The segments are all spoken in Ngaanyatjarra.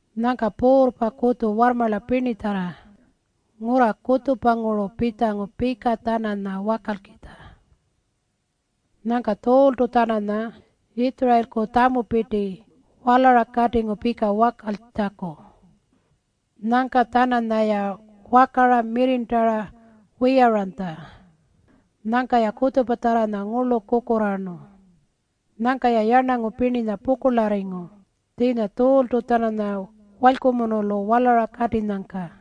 Nyangka puurrpa kutju warrmarla pirnitjarra ngurra kutjupanguru pitjangu-tjananya pika wakalkitja. Nyangka Tjuultu-tjananya Yitjurayilku tjamupirti walara katingu pika wakaltjaku. Nyangka-tjananyaya wakara mirrirntara wiyaranytja. Nyangka-ya kutjupatjarranya ngurlu kukurraarnu. Nyangka-ya yarnangu pirninya pukurlarringu tjiinya Tjuultu-tjananya walykumunulu walara katinyangka.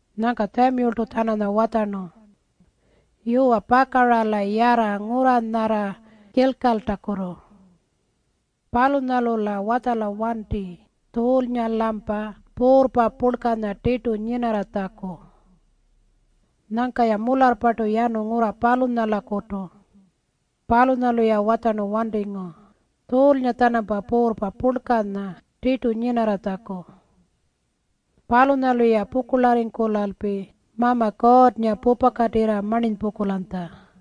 Nyangka Tjamiyultu-tjananya watjarnu, “Yuwa, pakara-la yarra ngurra nyarra Kilkaltakutu. Palunyalu-la watjala wanti Tjuulnga-lampa puurrpa purlkanya tirtu nyinarratjaku.” Nyangka-ya mularrpartu yanu ngurra palunyalakutu. Palunyalu-ya watjarnu wantingu Tjuulnga-tjanampa puurrpa purlkanya tirtu nyinarratjaku. Palunyalu-ya pukurlarringkulalpi Mama Kuurrnga pupakatirra marninypungkulanytja.